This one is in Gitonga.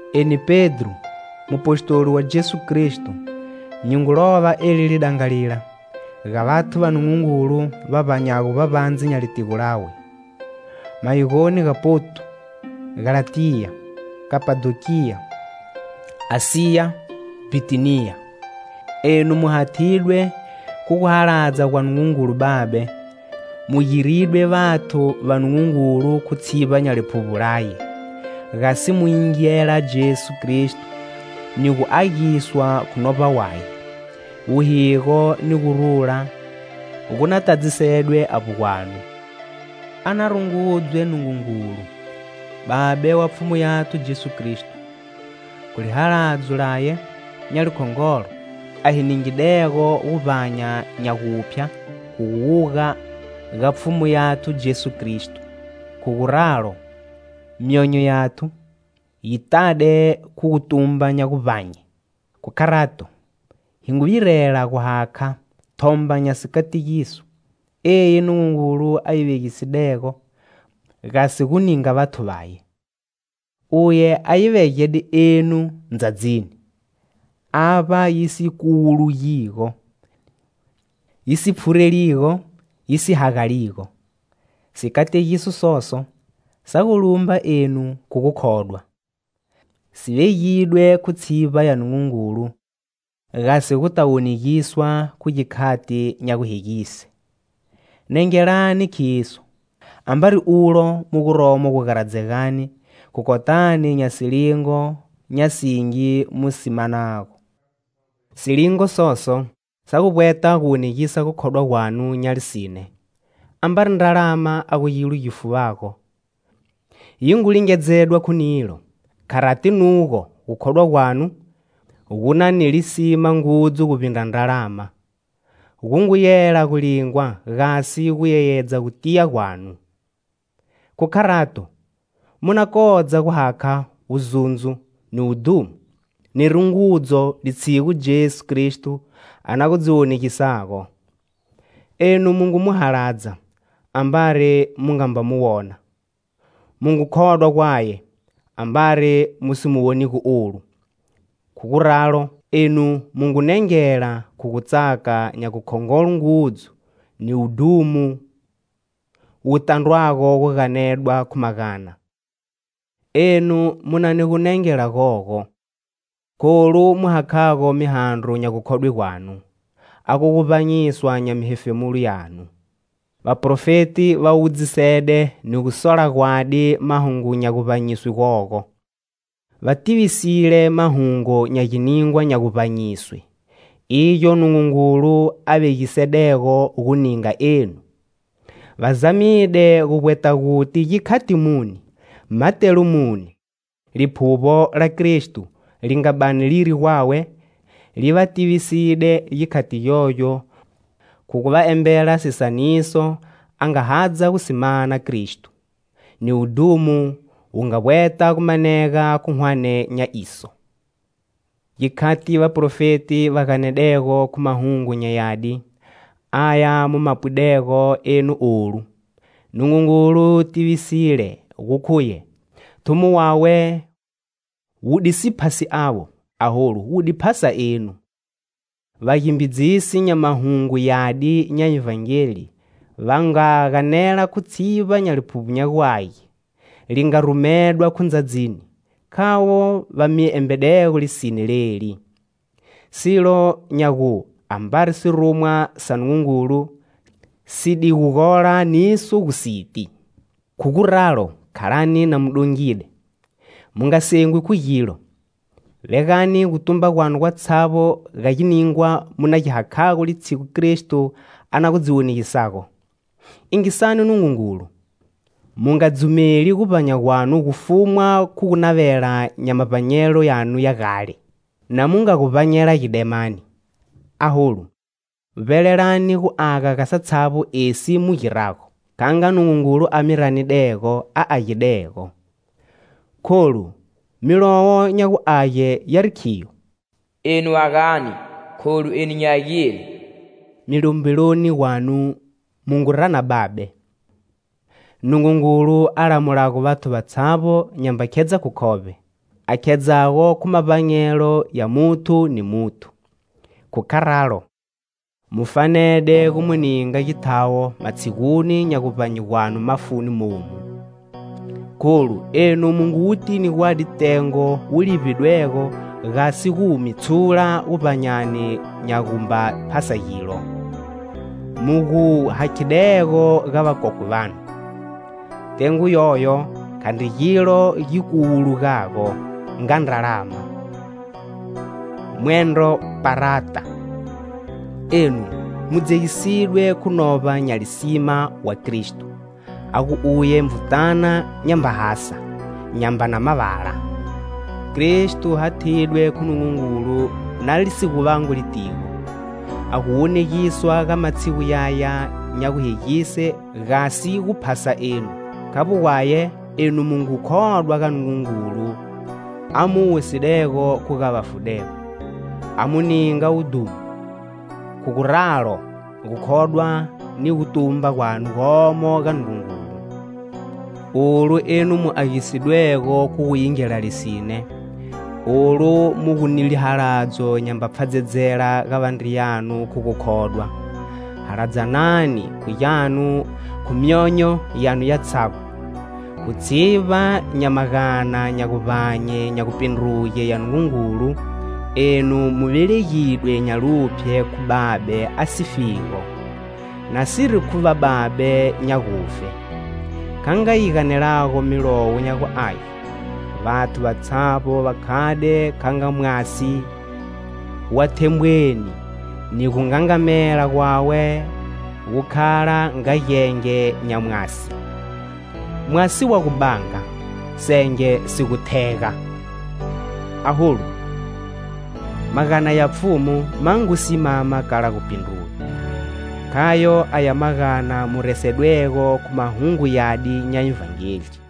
Eni, Pedro, mupostoli wa Jesu Kristo, nyi ngu lova eli lidangalila ga vathu va Nungungulu va vbanyago vbavbandze nya litigo lawe, mayigoni ga Ponto, Galatiya, Kapadokiya, Asiya, Bhitiniya. Enu mu hathidwe khu guhaladza gwa Nungungulu Babe, mu giridwe vathu va Nungungulu khu tshivba nya Liphuvbo laye, gasi mu yingela Jesu Kristo ni gu agiswa khu Novba waye. Wuhigo ni gurula gu na tadzisedwe avbo gwanu. A na rungudzwe Nungungulu, Babe wa Pfhumu yathu Jesu Kristo, khu lihaladzo laye nya likhongolo, a hi ningidego guvbanya nya guphya khu guwuga ga Pfhumu yathu Jesu Kristo. Khu guralo, myonyo yathu yi tade khu gutumba nya guvbanye. Khu kharato, hi ngu virela gu hakha thomba nya sikategiso, eyi Nungungulu a yi vegisidego gasi gu ninga vathu vaye. Uye a yi vegede enu ndzadzini, avba yi si kuwulugigo, yi si pfhureligo, yi si hagaligo. Sikategiso soso sa gu lumba enu khu gukhodwa, si vegidwe khu tshivba ya Nungungulu, gasi mu mana guvbanya gu dongisedwego gasi guta wonegiswa khu gikhati nya guhegise. Nengelani khiso, ambari ulo mu guromo gugaradzegani khu kotani nya silingo nya singi mu si manago. Silingo soso sa gu vbweta guwonegisa gukhodwa gwanu nya lisine. Ambari ndralama a gu gilo gi fuvago, yi ngu lingedzedwa khu nilo; kharati nugo gukhodwa gwanu, gu na ni lisima ngudzu guvbindra ndralama, gu ngu yela gu lingwa gasi gu yeyedza gutiya gwanu. Khu kharato, mu na kodza guhakha wuzundzo, ni wudhumo, ni rungudzo litshigu Jesu Kristo a na gu dzi wonegisago. Enu mu ngu mu haladza, ambari mu nga mba mu wona; mu ngu khodwa gwaye, ambari mu si mu wonigo olu. Khu guralo, enu mu ngu nengela khu gutsaka nya gukhongolo ngudzu ni wudhumo wu tandrwago gu ganedwa khu magana. Enu mu na ni gunengela gogo kholu mu hakhago mihandro nya gukhodwe gwanu, a gu guvbanyiswa nya mihefemulo yanu. Vaprofeti va wudzisede ni gusola gwadi mahungu nya guvbanyiswe gogo, va tivisile mahungu nya giningwa nya guvbanyiswe, igyo Nungungulu a vegisedego gu ninga enu. Va zamide gu vbweta guti gikhati muni, matelo muni; Liphuvbo la Kristo li nga bani liri gwawe li va tiviside gikhati gyogyo khu gu va embela sisaniso a nga hadza gu si mana Kristo, ni wudhumo wu nga vbweta gu manega khu hwane nya iso. Gikhati vaprofeti va ganedego khu Mahungu nya Yadi, aya mu ma pwidego enu olu, Nungungulu tivisile gu khuye thumo wawe wu di si phasi avo, aholu wu di phasa enu. Vagimbidzisi nya Mahungu Yadi nya Ivhangeli va nga ganela khu tshivba nya Liphuvbo nya gu Age, li nga rumedwa khu ndzadzini, khavo va mi embedego lisine leli. Silo nya gu, ambari sirumwa sa Nungungulu si di gu gola niso gu siti. Khu guralo, khalani na mu dongide, mu nga sengwi khu gilo; vegani gutumba gwanu gwatshavbo ga giningwa mu na gi hakhago litshigu Kristo a na gu dzi wonegisago. Yingisani Nungungulu, mu nga dzumeli guvbanya gwanu gu fumwa khu gunavela nya mavbanyelo yanu ya gale; na mu nga gu vbanyela gidemani. Aholu, vbelelani guaga ga satshavbo esi mu girago, kha nga Nungungulu a mi ranidego a agidego. Kholu Milowo nya gu Age yari khiyo: "Enu agani, kholu eni nyi agile." Milombeloni gwanu mu ngu rana Babe, Nungungulu a lamulago vathu vatshavbo nyamba khedza khu khovbe, a khedzago khu mavbanyelo ya muthu ni muthu; khu kharalo, mu fanede gu mu ninga githawo matshiguni nya guvbanye gwanu mafuni momu. Kholu enu mu ngu wutini gwadi tengo wu livbidwego gasi gu mi tshula guvbanyani nya gumba phasa gilo, mu gu hakhidego ga vakokwe vanu. Tengo yoyo khandri gilo gi kuwulugago nga ndralama mwendro parata. Enu mu dzegisidwe khu Novba nya lisima wa Kristo, a gu uye Nvutana nyamba hasa, nyambana mavala. Kristo hathidwe khu Nungungulu na li si gu vangwi litigo, a gu wonegiswa ga matshigu yaya nya guhegise, gasi gu phasa enu. Khavbo gwaye, enu mu ngu khodwa ga Nungungulu a mu wusidego khu ga vafudego, a mu ninga wudhumo. Khu guralo, gukhodwa ni gutumba gwanu gomo ga Nungungulu. Olu enu mu agisidwego khu gu yingela lisine; olu mu gu ni lihaladzo nyamba pfhadzedzela ga vandriyanu khu gukhodwa, haladzanani khu gyanu khu myonyo yanu yatshavbo. Khu tshivba nya magana nya guvbanye nya gupindruge ya Nungungulu, enu mu velegidwe nya luphye khu Babe a sifigo, nasiri khu vababe nya gufe. Kha nga yi ganelago Milowo nya gu Age:"Vathu vatshavbo va khade kha nga mwasi wa thembweni,ni gungangamela gwawe gu khala nga genge nya mwasi;mwasi wa gu banga, senge si gu thega. Aholu, magana ya Pfhumu ma ngu simama kala gupindruga."Khayo aya magana mu resedwego khu Mahungu Yadi nya Ivhangeli.